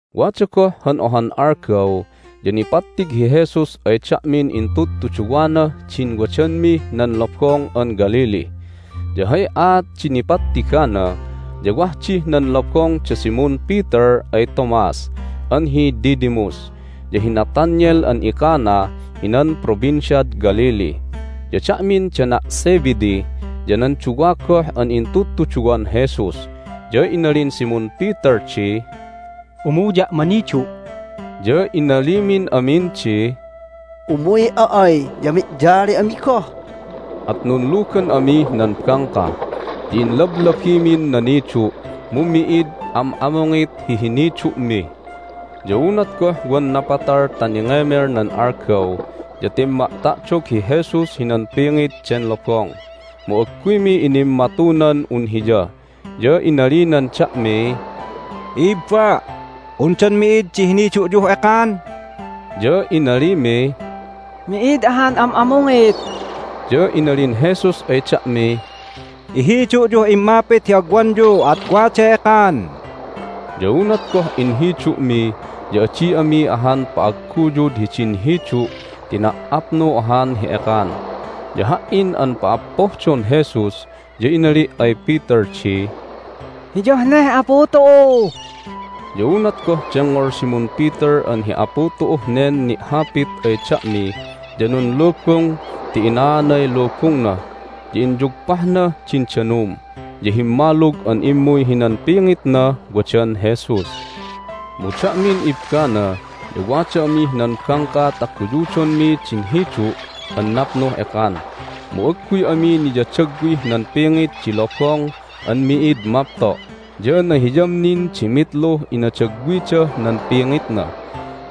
Wada goh han ohan algaw ya nipattig hi Jesus ay da'min intudtuduwanah din wadanmih nan Lobong an Galilee. Ya hay aat di nipattigana ya wah dih nan lobong da Simon Peter ay Thomas (an hi Didymus), ya hi Nathanael an iCana hinan Provinciad Galilee, ya da'min dana' Zebedee, ya nan duwa goh an intudtuduwan Jesus. Ya inalin Simon Peter di, "Umuya' manidu'." Ya inalimin amin di, "Umuy'a ay ya mi'yali ami goh." At nunlugan amih nan bangka, ya inlablabimin nanidu', mu mi'id am'amungit hi hinidu'mi. Ya unat goh wan napatal ta ningemel nan algaw ya timma'ta'dog hi Jesus hinan pingit den lobong, mu agguymi inimmatunan un Hiya. Ya inalinan da'miy, "I'ibba', undan mi'id di hinidu'yuh ekan?" Ya inalimiy, "Mi'id ahan am'amungit." Ya inalin Jesus ay da'miy, "Ihidu'yuh immapit hi agwanyu, at waday ekan." Ya unat goh inhidu'mi ya adi ami ahan pa'agguyud hidin hidu' ti na"apnu ahan hi ekan. Ya ha"in an pa"appohdon Jesus ya inali' ay Peter di, "Hiyah neh Apu tu'u!" Ya unat goh dengngol Simon Peter an hi Apu tu'uh nen ni'hapit ay da'mi ya nunlubung ti ina'aanay lubungna, ya inyugpahnah din danum, ya himmalug an immuy hinan pingitnah wadan Jesus. Mu da'min ibbana ya wada amih nan bangka ta guyudonmi din hidu' an napnuh ekan, mu agguy ami niyadagwih nan pingit di lobong an mi'id mapto' ya nahiyam nin di mitluh inadagwidah nan pingitna.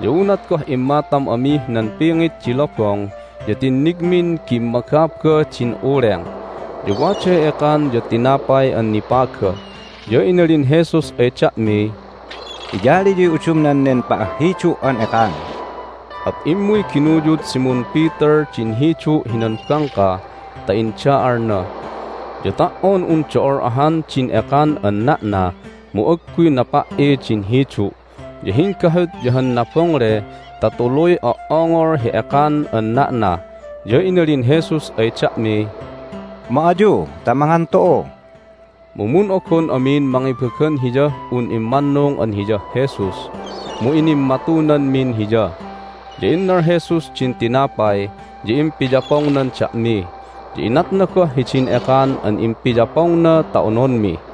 Ya unat goh immatam amih nan pingit di lobong ya tinnigmin gimmagaba din uleng, ya waday ekan ya tinapay an nipaga. Ya inalin Jesus ay da'miy, "Iyaliyuy udumnan nen pa'ahhidu' an ekan." At immuy ginuyud Simon Peter din hidu' hinan bangka ta inda'alna. Ya ta"on un do'ol ahan din ekan an na'na mu agguy napa"i din hidu'. Ya hinggahut ya han nabongle ta tuluy o"ongol hi ekan an na'na. Ya inalin Jesus ay da'miy, "Ma ayu ta mangan tu'u." Mu mun'ogon amin mangibagan Hiyah un immannung an Hiyah Jesus, mu inimmatunanmin Hiya. Ya innal Jesus din tinapay, ya impiyapongnan da'mi, ya inatna goh hidin ekan an impiyapongna ta ononmi.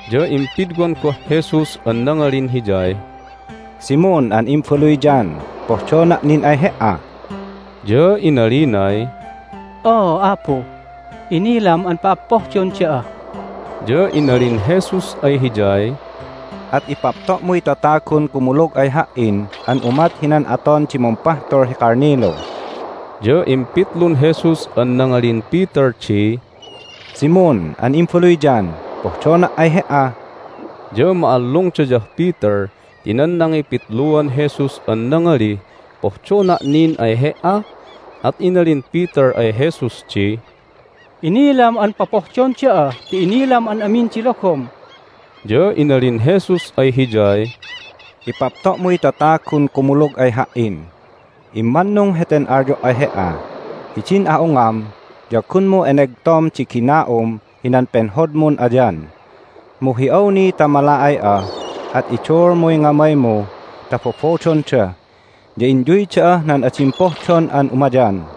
Ya impidwan goh Jesus an nangalin hiyay, "Simon an imbaluy John, pohdona' nin ay he"a?" Ya inalinay, "Oo, Apu, inilam an pa'appohdon da'a." Ya inalin Jesus ay hiyay, "At ipapto'muy tatagun kumulug ay Ha"in an umat hinan aton di mumpahtul hi kalnilu." Ya impitlun Jesus an nangalin Peter di, "Simon an imbaluy John, pohdona' ay he"a?" Ya ma'allungdayah Peter ti nan nangipitluan Jesus an nangalih, "Pohdona' nin ay he"a?" At inalin Peter ay Jesus di, "Inilam an popohdon da'a ti inilam an amin di logom!" Ya inalin Jesus ay hiyay, "Ipapto'muy tatagun kumulug ay Ha"in. Immannung heten alyo' ay he"a: hidin a'ungam ya gunmu enegtom di gina'um hinan penhodmun ayan, mu hi awni ta mala'ay'a at iduulmuy ngamaymu ta bobodonda, ya inyuy da'ah nan adim pohdon an umayan."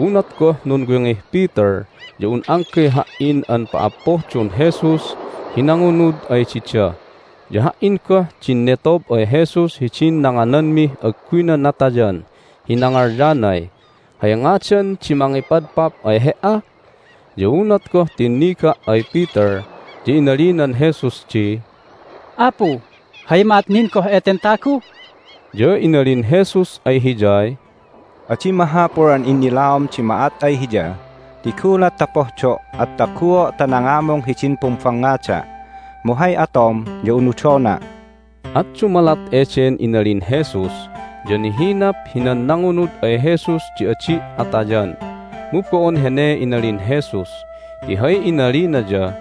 Unat goh nunwingih Peter ya un anggay ha"in an pa"appohdon Jesus hi nangunud ay dida. (Ya ha"in goh din netob ay Jesus hidin nangananmih agguyna natayan hi nangalyanay, "Hay ngadan di mangipadpap ay He"a?") Ya unat goh tinniga' ay Peter ya inalinan Jesus di, "Apu, hay ma'at nin goh eten tagu?" Ya inalin Jesus ay hiyay, "Adi mahapul an innilaom di ma'at ay hiya ti gulat ta pohdo' at taguo' ta nangamung hidin pumbangngada'. Mu hay atom ya unudona'." At dumalat eden inalin Jesus ya nihinap hinan nangunud ay Jesus di adi' atayan. Mu bo'on hene inalin Jesus, ti hay inalina ya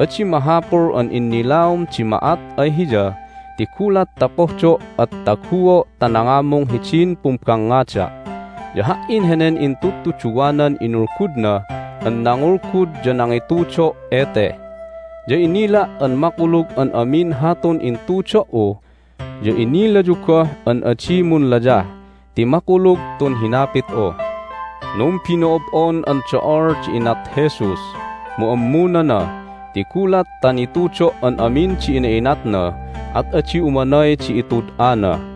"Adi mahapul an innilaom di ma'at ay hiya, ti gulat ta pohdo' at taguo' ta nangamung hidin pumbangngada'." Ya ha"in henen intudtuduwanan inulgudna an nangulgud ya nangitudo' ete. Ya inila' an makulug an amin hatun intudo"u, ya inilayu goh an adi munlayah ti makulug tun hinapit'u. Numbino'ob'on an do'ol di inat Jesus, mu ammunana. Ti gulat ta nitudo' an amin di ina'inatna at adi umanay di itud'ana.